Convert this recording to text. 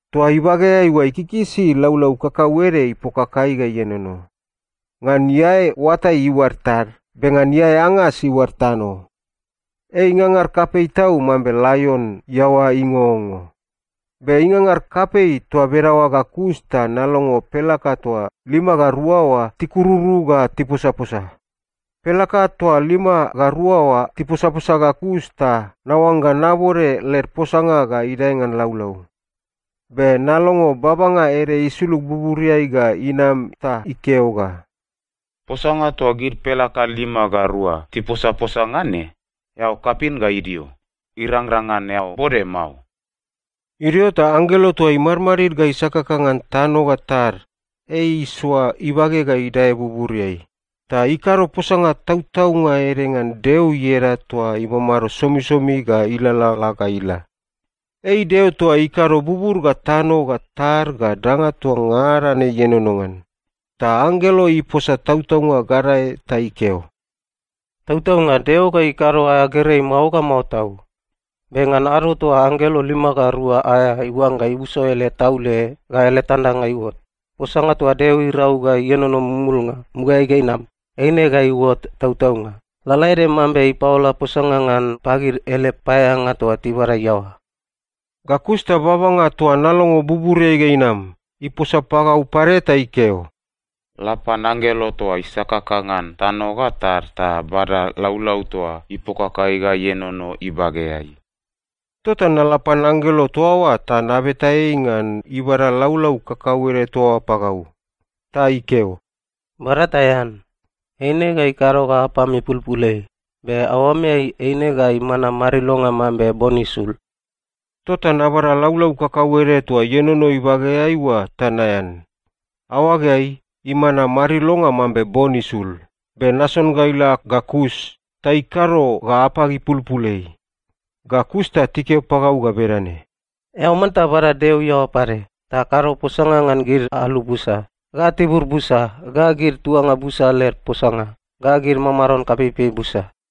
Toa ibageai oa ikikisi laulau kakauede ipokakai ga ienono. Ngan iae oatai iuad tad, be ngan iae angas iuad tano. Ei ingangar kapei tau mambe laion iaoa ingongo. Be ingangar kapei toa bedaoa ga kus ta nalongo pelaka toa lima ga rua oa tikururu ga tiposaposa. Pelaka toa lima ga rua oa tiposaposa ga kus, ta naoangga nabode led posanga ga idae ngan laulau. Be nalongo babanga ede isulug buburiai ga inam ta ikeo ga, “Posanga toa gid pelaka lima ga rua tiposaposa ngan ne, eao kapin ga idio. Irangrang ngan eao bode mao.” Idio ta anggelo toa imadmadid ga isakaka ngan tano ga tad, ei isoa ibage ga idae buburiai. Ta ikado posanga tautaunga ede ngan Deo ieda toa imamado somisomi ga ilalala ga ila. Ei Deo toa ikado bubur ga tano ga tad ga danga toa ngada ne ienono ngan. Ta anggelo iposa tautaunga gadae ta ikeo, “Tautaunga, Deo ga ikado aea gerei mao ga mao tau. Be ngan ado toa anggelo lima ga rua aea iuangga iuso ele taule ga ele tandanga iuot, posanga toa Deo irau ga ienono mumulnga mugaeai ga inam, eine ga iuot tautaunga, lalaede mambe ipaola posanga ngan pagid ele paeaeanga toa tibabada iaoa.” Ga kus ta babanga toa nalongo buburiai ga inam, iposa pagau pade ta ikeo, “La pan anggelo toa isakaka ngan tano ga tad ta bada laulau toa ipokakai ga ienono ibageai.” Tota nala pan anggelo toa oa ta nabeta ei ngan ibada laulau kakauede toa oa pagau. Ta ikeo, “Bada ta ean. Eine ga ikado ga apam ipulpul ei. Be aoameai eine ga imana marilonga mambe bon isul.” Tota nabada laulau kakauede toa ienono ibageai oa ta naean. Aoageai, imana marilonga mambe bon isul, be nason ga ila ga kus, ta ikado ga apag ipulpul ei. Ga kus ta tikeo pagau ga bedane, “Eao manta bada Deo iaoa pade, ta kado posanga ngan gid alu busa, ga tibur busa, ga gid tuanga busa led posanga, ga gid mamaron kapeipei busa.”